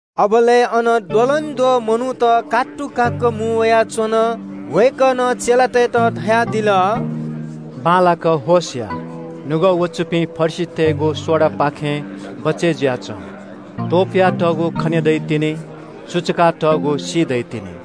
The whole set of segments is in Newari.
अबलय् अन द्वलंद्वः मनूत कात्तुकाक्क मुं वयाच्वन। वय्कलं चेलातय्त धयादिल – “बांलाक होश या। निपाः ख्वाःपाः दुपिं फरिसीतय्गु सोडापाखें बचय् जुयाच्वँ। त्वपुयातःगु खने दइतिनि। सुचुकातःगु सी दइतिनि।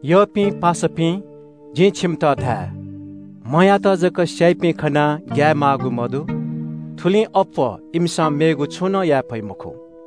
“यःपिं पासापिं, जिं छिमित धाये – म्हयात जक स्याइपिं खनाः ग्याये माःगु मदु। थुलिं अप्वः इमिसं मेगु छुं नं याये फइ मखु।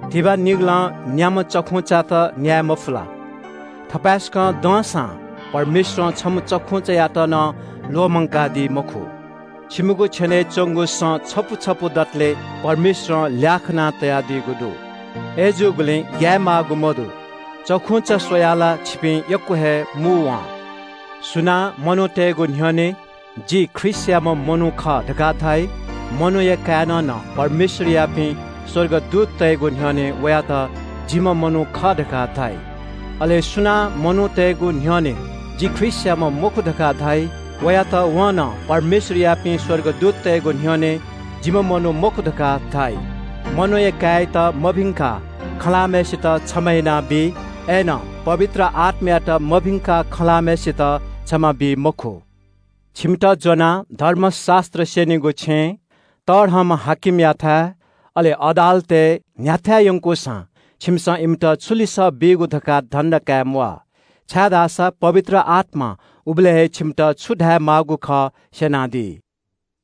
“धिबा निगलं न्याम्ह चखुंचात न्याये मफु ला? थपाय्सकं दंसां परमेश्वरं छम्ह चखुंचायात नं ल्वःमंकादी मखु। छिमिगु छेनय् च्वंगु सँ छपु छपु दतले परमेश्वरं ल्याः खाना तयादीगु दु। अय्जूगुलिं ग्याये माःगु मदु। चखुंचा स्वयाः ला छिपिं यक्व हे मू वं।” “सुनां मनूतय्गु न्ह्यःने ‘जि ख्रीष्टयाम्ह मनू खः’ धकाः धाइ, मनूया काय्नं नं परमेश्वरयापिं स्वर्गदूततय्गु न्ह्यःने वयात ‘जिम्ह मनू खः’ धकाः धाइ। अले सुनां मनूतय्गु न्ह्यःने ‘जि ख्रीष्टयाम्ह मखु’ धकाः धाइ वयात वं नं परमेश्वरयापिं स्वर्गदूततय्गु न्ह्यःने ‘जिम्ह मनू मखु’ धकाः धाइ। मनूया काय्यात मभिंकाः खँ ल्हाःम्हय्सित क्षमा यानाबी, अय्नं पवित्र आत्मायात मभिंकाः खँ ल्हाःम्हय्सित क्षमा बी मखु। “छिमित ज्वनाः धर्मशास्त्र स्यनीगु छेँ, तःधंम्ह हाकिमयाथाय्, अले अदालतय् न्ह्याथाय् यंकूसां छिमिसं इमित छु लिसः बीगु धकाः धन्दा काये म्वाः। छाय्धाःसा पवित्र आत्मां उबलय् हे छिमित छु धायेमाःगु खः स्यनादी।”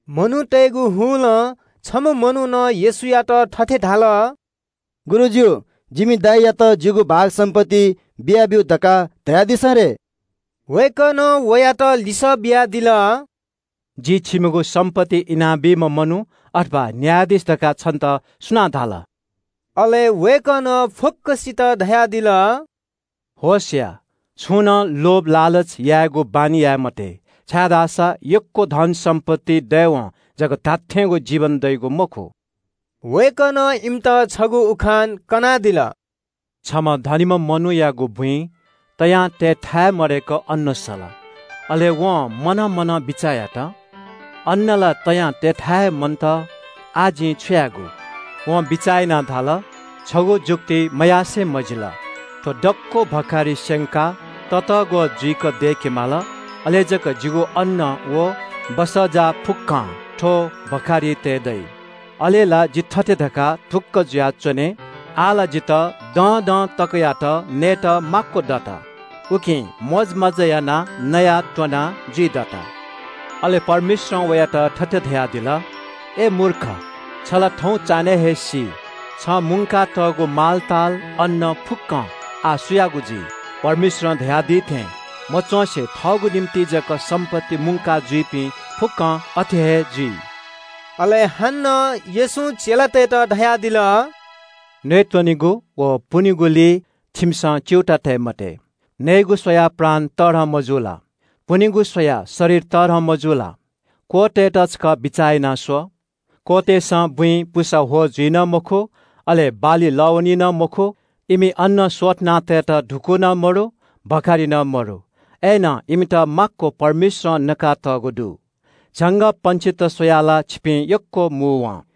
मनूतय्गु हुलं छम्ह मनुखं येशूयात थथे धाल – “गुरुजु, जिमि दाजुयात अबुया सम्पत्ति इनाब्यु धकाः धयादिसँ रे।” वय्कलं वयात लिसः बियादिल – “जि छिकपिनिगु सम्पत्ति इनाबीम्ह मनू अथवा न्यायाधीश धकाः छितः सुनां धाल?” अले वय्कलं फुक्कसित धयादिल – “होश या, छुं नं लोभ लालच यायेगु बानी याये मते, छाय्धाःसा यक्व धनसम्पत्ति दयेवं जक धात्थेंगु जीवन दइगु मखु।” वय्कलं इमित छगू उखान कनादिल। “छम्ह तःमिम्ह मनूयागु बुँइ तयां तयेथाय् मदय्क अन्न सल। अले वं मनं मनं बिचाः यात – ‘अन्न ला तयां तयेथाय् हे मन्त, आः जिं छु यायेगु?’ वं बिचाः यानाः धाल – ‘छगू जुक्ति मयासें मजिल। थ्व दक्व भखारि स्यंकाः ततःग्वः जुइक दय्केमाल, अले जक जिगु अन्न व सामान फुक्कं थ्व भखारिइ तये दइ। अले ला जि थथे धकाः ढुक्क जुयाच्वने – “आः ला जितः दँदं तकयात नयेत माक्व दत। उकिं मोजमज्जा यानाः नयाःत्वनाः जुइदत।”’ “अले परमेश्वरं वयात थथे धयादिल – ‘अय् मूर्ख, छ ला थौं चान्हय् हे सी। छं मुंकातःगु धन, अन्न फुक्कं आः सुयागु जुइ?’ “परमेश्वरं धयादी थें मयासें थःगु निंतिं जक सम्पत्ति मुंका जुइपिं फुक्कं अथे हे जुइ।” अले हानं येशूं चेलातय्त धयादिल – “नयेत्वनेगु व पुनेगुलिइ छिमिसं च्यूताः तये मते। नयेगु स्वयाः प्राण तःधं, मजू ला? पुनेगु स्वयाः शरीर तःधं, मजू ला? क्वःतय्त छकः बिचाः यानाः स्व। क्वःतय्सं बुँइ पुसा ह्वः जुइ नं मखु, अले बाली लः वनी नं मखु। इमि अन्न स्वथना तयेत धुकू नं मदु, भखारि नं मदु। अय्नं इमित माक्व परमेश्वरं नका तःगु दु। झंगःपंक्षीत स्वयाः ला छिपिं यक्व मू वं।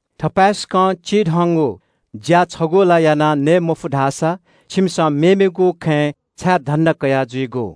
थपाय्सकं चिधंगु ज्या छगू ला याना नये मफु धाःसा छिमिसं मेमेगु खँय् छाय् धन्दा कयाः जुइगु?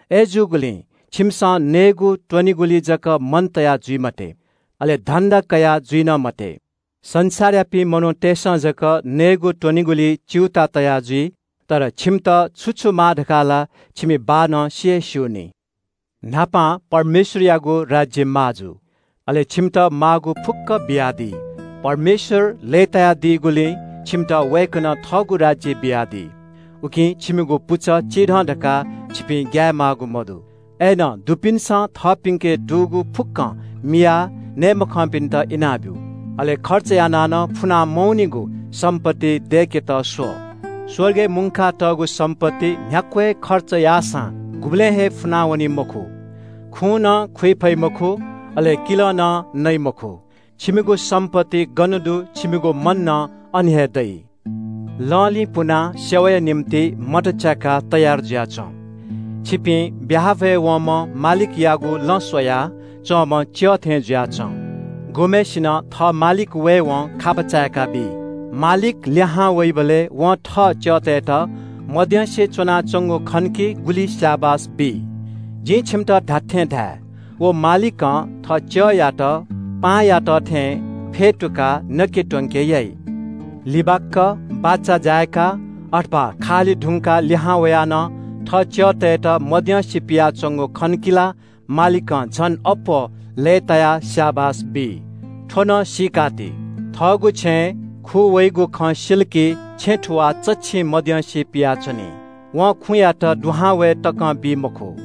“अय्जूगुलिं छिमिसं नयेत्वनेगुलिइ जक मन तया जुइ मते, अले धन्दा कयाजुइ नं मते। संसारयापिं मनूतय्सं जक नयेत्वनेगुलिइ च्यूताः तया जुइ। तर छिमित छु छु माः धकाः ला छिमि बाःनं सि हे स्यूनि। न्हापां परमेश्वरयागु राज्य माः जु, अले छिमित माःगु फुक्क बियादी। “परमेश्वर लय्तायादीगुलिं छिमित वय्कलं थःगु राज्य बियादी। उकिं छिमिगु पुचः चिधं धकाः छिपिं ग्याये माःगु मदु। “अय्नं दुपिन्सं थःपिन्के दुगु फुक्कं मियाः नये मखंपिन्त इनाब्यु। अले खर्च यानाः नं फुना मवनीगु सम्पत्ति दय्केत स्व। स्वर्गय् मुंकातःगु सम्पत्ति न्ह्याक्व हे खर्च याःसां गुबलें हे फुनावनी मखु, खुं नं खू वइ मखु, अले किलं नं नइ मखु। छिमिगु सम्पत्ति गन दु छिमिगु मन नं अन हे दइ।” “वसः फिनाः सेवाया निंतिं मत च्याकाः तयार जुयाच्वँ। छिपिं ब्याहा भ्वय् वंम्ह मालिकयागु लँ स्वया च्वंम्ह च्यः थें जुयाच्वँ। गुम्हय्सिनं थः मालिक वयेवं खापा चाय्काबी। मालिक लिहां वइबलय् वं थः च्यःतय्त मद्यंसे च्वनाच्वंगु खन कि गुलि स्याबास बी। जिं छिमित धात्थें धाये – व मालिकं थः च्यःयात पाहांयात थें फ्यतुकाः नके त्वंके याइ। लिबाक्क बाचा जाय्का वा खा हाली धुंकाः लिहां वयाः नं थः च्यःतय्त मद्यंसे पियाच्वंगु खन कि ला मालिकं झन अप्वः लय्तायाः स्याबास बी। “थ्व नं सीकाति – थःगु छेँय् खू वइगु खँ सिल कि छेँ थुवाः चच्छिं मद्यंसे पियाच्वनी। वं खुँयात दुहां वये तकं बी मखु।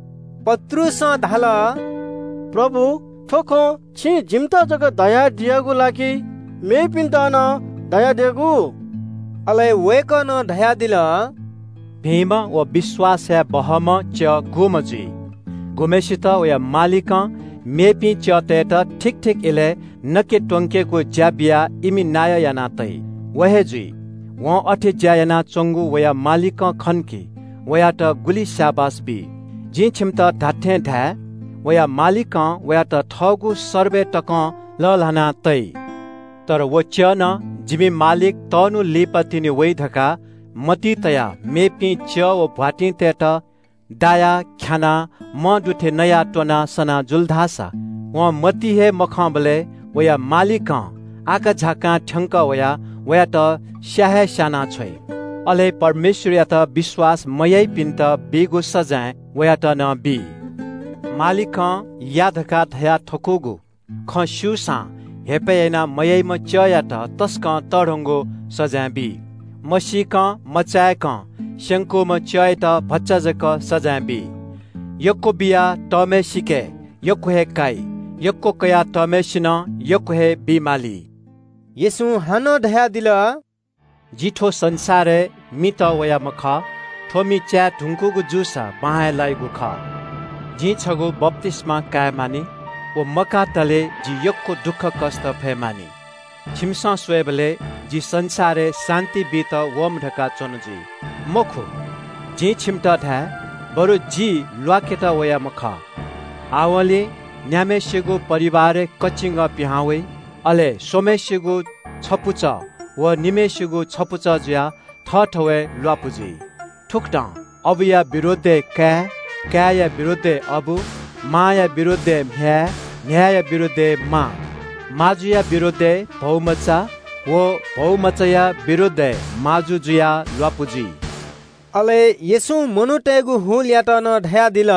पत्रुसं धाल – “प्रभु, थ्व खँ छिं जिमित जक धयादियागु ला कि मेपिन्त नं धयादियागु?” अले वय्कलं धयादिल – “भिंम्ह व विश्वास याये बहःम्ह च्यः सु जुइ? गुम्हय्सित वया मालिकं मेपिं च्यःतय्त ठीक ठीक इलय् नके त्वंकेगु ज्या बियाः इमि नायः याना तइ, व हे जुइ। वं अथे ज्या यानाच्वंगु वया मालिकं खन धाःसा वयात गुलि स्याबास बी। जिं छिमित धात्थें धाये – वया मालिकं वयात थःगु सर्बय तकं लःल्हाना तइ। तर वं ‘जिमि मालिक तःन्हु लिपा जक वइ’ धकाः मतिइ तयाः मेपिं च्यः व भ्वातिंतय्त दायाः ख्यानाः मंदु थें नयाःत्वनाः सनाः जुल धाःसा वं मतिइ हे मतःबलय् वया मालिकं आकाझाकां थ्यंकः वयाः वयात स्या हे स्यानाछ्वइ। अले परमेश्वरयात विश्वास मयाइपिन्त बीगु सजाँय वयात नं बी। “मालिकं या धकाः धयाथकूगु खँ स्यूसां हेपय् यानाः मयाइम्ह च्यःयात तसकं तःधंगु सजाँय बी। मसीकं मचाय्कं स्यंकूम्ह च्यःयात भचा जक सजाँय बी। यक्व बिया तःम्हय्सिके यक्व हे काइ, यक्व कयातःम्हय्सिनं यक्व हे बी माली।” येशूं हानं धयादिल – “जि थ्व संसारय् मि तःवयाम्ह खः। थ्व मि च्याये धुंकूगु जूसा बां हे लाइगु खः। जिं छगू बप्तिस्मा काये मानि। व मकातले जिं यक्व दुःखकष्ट फये मानि। छिमिसं स्वयेबलय् जि संसारय् शान्ति बीत वःम्ह धकाः च्वन जुइ? मखु, जिं छिमित धाये – बरु जि ल्वाकेत वयाम्ह खः। आवंलि न्याम्हय्सिगु परिवारय् कचिंगः पिहां वइ, अले स्वम्हय्सिगु छपुचः व निम्हय्सिगु छपुचः जुयाः थःथवय् ल्वापु जुइ। “‘थुकथं अबुया विरोधय् काय्, काय्या विरोधय् अबु, मांया विरोधय् म्ह्याय्, म्ह्याय्या विरोधय् मां, माजुया विरोधय् भौमचा, व भौमचाया विरोधय् माजु जुयाः ल्वापु जुइ।’” अले येशूं मनूतय्त धयादिल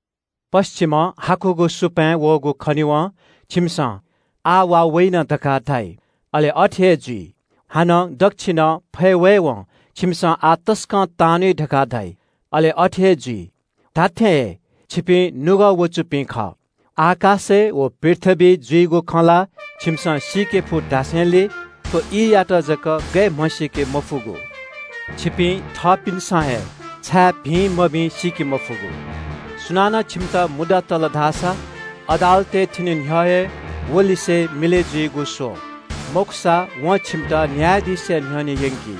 – “पच्छिमं हाकुगु सुपाँय् वःगु खनेवं छिमिसं ‘आः वा वइन’ धकाः धाइ, अले अथे हे जुइ। हानं दच्छिनं फय् वयेवं छिमिसं ‘आः तसकं तांन्वइ’ धकाः धाइ, अले अथे हे जुइ। धात्थें हे, छिपिं निपाः ख्वाःपाः दुपिं खः। आकाशय् व पृथ्वीइ जुइगु खँ ला छिमिसं सीके फु धासेंलि थ्व ईयात जक गय् म्हसीके मफुगु? “छिपिं थःपिन्सं हे छाय् भिं मभिं सीके मफुगु? सुनानं छिमित मुद्दा तल धाःसा अदालतय् थ्यने न्ह्यः हे वलिसे मिलय् जुइगु स्व। मखुसा वं छिमित न्यायाधीशया न्ह्यःने यंकी।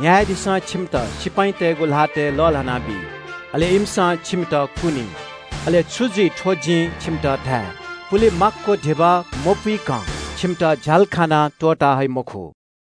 न्यायाधीशं छिमित सिपाइँतय्गु ल्हातय् लःल्हानाबी। अले इमिसं छिमित कुनी। अले छु जुइ थ्व जिं छिमित धाये – पुले माक्व धिबा मपुइकं छिमित झ्यालखानां त्वःता हइ मखु।”